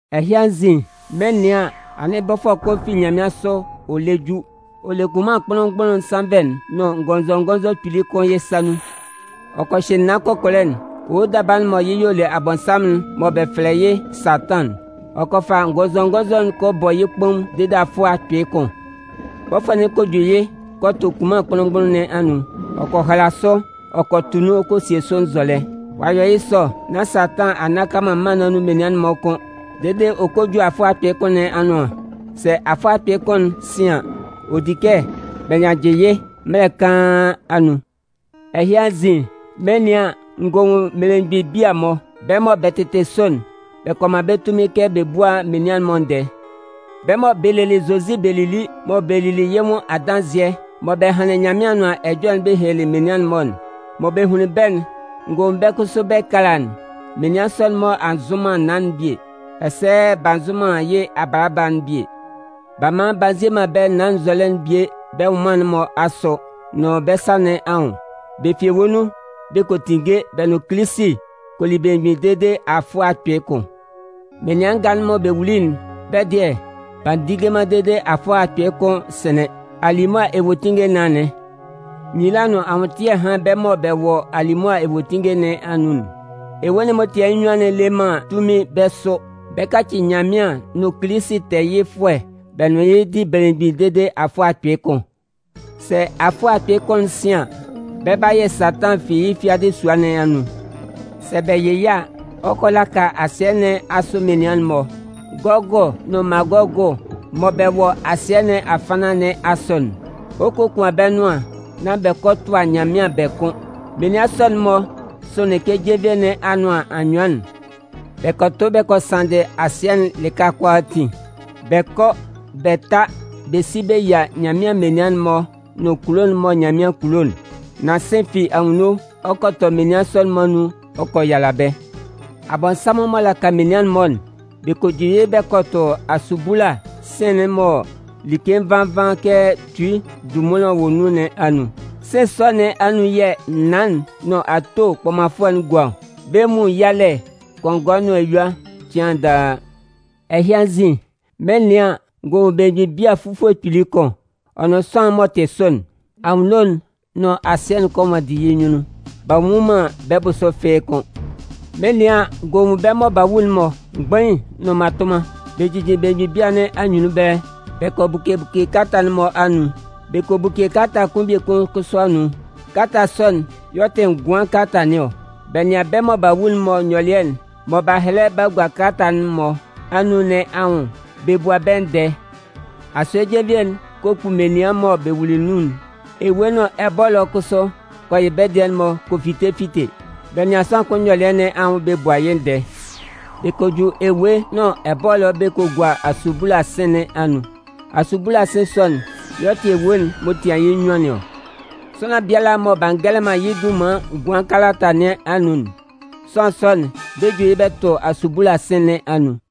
Ɛhɩ anzin, mɩn 'nɩan an, anɩn bɔfʋɛ kʋn fi nyanmɩansʋ ɔ lɛ ju. Ɔ le kunman kpʋnlʋn-mgbʋnlʋn'n sannvɛ'n nʋn ngɔnzɔngɔnzɔ kpili kʋn yɩ́ sa nun. Ɔ kɔ hyɩ naan kɔkɔlɛ'n, owo daba'n mɔ yɩ́ y'ɔ le Abɔnsanmʋn'n mɔ bɛ fɛlɛ yɩ́ Satan'n. Ɔ kɔ fa ngɔnzɔngɔnzɔ'n kɔ bɔ yɩ́ kpaun dede afʋɛ akpɩɩ kʋn. Bɔfʋɛ'n kɔ ju yɩ́ kɔ tʋ kunman kpʋnlʋn-mgbʋnlʋn nɩn anun, ɔ kɔ hala sʋ ɔ kɔ tʋ nun ɔ kɔ sie sʋ nzɔlɛ. Ɔ'a yɔ yɩ́ sɔ nán Satan a nnaka man mân nɩn anun menian'n-mɔ kʋ́n dede ɔ kɔ ju afʋɛ akpɩɩ kʋn nɩn anʋan. Sɛ afʋɛ akpɩɩ kʋn'n sɩn an, ɔ di kɛ bɛ nyannjɩ yɩ́ mɛlɛ kaan anun. Ɛhɩ anzin, mɩn 'nɩan an, n gɔ nwun mmelemgbin bia-mɔ. Bɛ́ mɔ bɛ tɩtɩ sʋ'n, bɛ kɔ man bɛ́ tunmin kɛ bɛ búa menian'n-mɔ ndɛɛ. Bɛ́ mɔ bɛ lelɩ Zozi bɛ lili mɔ bɛ lili yɩ́ nwʋn adanzɩɛ, mɔ bɛ hanlɩn Nyanmɩan Anʋan Ɛjɔlɛ'n bɛ helelɩ menian'n-mɔ, mɔ bɛ hunlin bɛ́'n, n gɔ nwun bɛ́ kʋsʋ bɛ́ ɛkala'n. Menian sɔ'n-mɔ a nzʋ man naan'n bie, ɛsɛ b'a nzʋ man yɩ́ abaaba'n bie. B'a man b'a nzie man bɛ́ naan'n nzɔlɛ'n bie bɛ́ nwʋnman nɩn asʋ nʋn bɛ́ sa nɩn anwʋn. Bɛ fi ewue nun bɛ kɔ tinnge bɛ nʋn Kilisi kɔ li belemgbin dede afʋɛ akpɩɩ kʋn. (Menian nga'n mɔ bɛ wuli'n, bɛ́ dɩɛ, b'a ndinnge man dede afʋɛ akpɩɩ kʋn'n sɩnlɩn) Alimʋa ewuetinnge nɩn anɩn. Nyila nʋn anwʋntɩɛ hán bɛ́ mɔ bɛ wɔ alimʋa ewuetinnge nɩn anun'n! Ewue'n m'ɔ tian yɩ́ nnyuan'n le man tunmin bɛ́ sʋ. Bɛ 'kaci Nyanmɩan nʋn Kilisi tɛɛyɩfʋɛ bɛ nʋn yɩ́ di belemgbin dede afʋɛ akpɩɩ kʋn. Sɛ afʋɛ akpɩɩ kʋn'n sɩn an, bɛ 'ba yɩ Satan fi yɩ́ fiadɩ sua nɩn anun. Sɛ bɛ yɩ yɩ́ a, ɔ 'kɔ a laka asɩɛ nɩn asʋ menian'n-mɔ, Gɔgʋ nʋn Magɔgʋ mɔ bɛ wɔ asɩɛ nɩn afannan nɩn asʋ'n. Ɔ 'kokuan bɛ́ nʋan nán bɛ kɔ tʋa Nyanmɩan bɛ kʋn. Menian sɔ'n-mɔ sʋnlɩn kɛ jenvie nɩn anʋan anyʋan'n. Bɛ kɔ tʋ bɛ kɔ sanndɩ asɩɛ'n lɩka kʋalaatin, bɛ kɔ bɛ ta bɛ si bɛ yia Nyanmɩan menian'n-mɔ nʋn kulo'n mɔ Nyanmɩan kulo'n. Nan sɩ̂n fi anwunno ɔ kɔ tɔ menian sɔ'n-mɔ anun ɔ kɔ yala bɛ́. Abɔnsanmʋn m'ɔ laka menian'n-mɔ'n, bɛ kɔ ju yɩ́ bɛ kɔ tʋ asubula sɩ̂n'n mɔ like nvan nvan kɛ tui ndunmunlan'n wɔ nun nɩn anun. Sɩ̂n sɔ nɩn anun yɛ̂ naan'n nʋn ato kpɔmanfʋɛ'n gua ɔ. Bɛ 'nwun yalɛ kɔngɔɛ nʋn eyua cɩan daa. Ɛhɩ anzin, mɩn 'nɩan an, n gɔ nwun belemgbin bia fufue kpili kʋn, ɔ nʋn sʋanlan'n m'ɔ tɩ sʋ'n. Anwunno'n nʋn asɩɛ'n kɔ nwanndi yɩ́ nyunnun, b'a nnwun man bɛ́ bʋsʋ fɩ́ɩ́ kʋ́n. Mɩn 'nɩan an, n gɔ nwun bɛ́ mɔ b'a wu'n-mɔ, mgbain nʋn mmatʋnman. Bɛ jijin belemgbin bia nɩn anyunnun ɛbɛlɛ. Bɛ kɔ buke buke kalata'n-mɔ anun. Bɛ kɔ buke kalata kʋn biekun kʋsʋ anun. Kalata sɔ'n y'ɔ tɩ ngʋan kalata nɩn ɔ. Bɛ nɩan bɛ́ mɔ b'a wu'n-mɔ nyɔlɩɛ'n mɔ b'a hɛlɛ b'a gua kalata'n-mɔ anun nɩn anwʋn bɛ bua bɛ́ ndɛɛ. Asue jenvie'n kɔ kpu menian mɔ bɛ wuli nun'n. Ewue nʋn ɛbɔlɔ kʋsʋ kɔ yɩ bɛ́ dɩɛ'n-mɔ kɔ fite fite. Bɛ nɩan sʋanlan kʋn nyɔlɩɛ nɩn anwʋn bɛ bua yɩ́ ndɛɛ. Bɛ kɔ ju ewue nʋn ɛbɔlɔ bɛ gua asubula sɩ̂n nɩn anun. (Asubula sɩ̂n sɔ'n y'ɔ tɩ ewue'n m'ɔ tian yɩ́ nnyuan nɩn ɔ.) Sʋanlan biala mɔ b'a ngɛlɛ man yɩ́ dunman ngʋan kalata nɩn anun'n, sʋanlan sɔ'n, bɛ 'ju yɩ́ bɛ tʋ asubula sɩ̂n nɩn anun.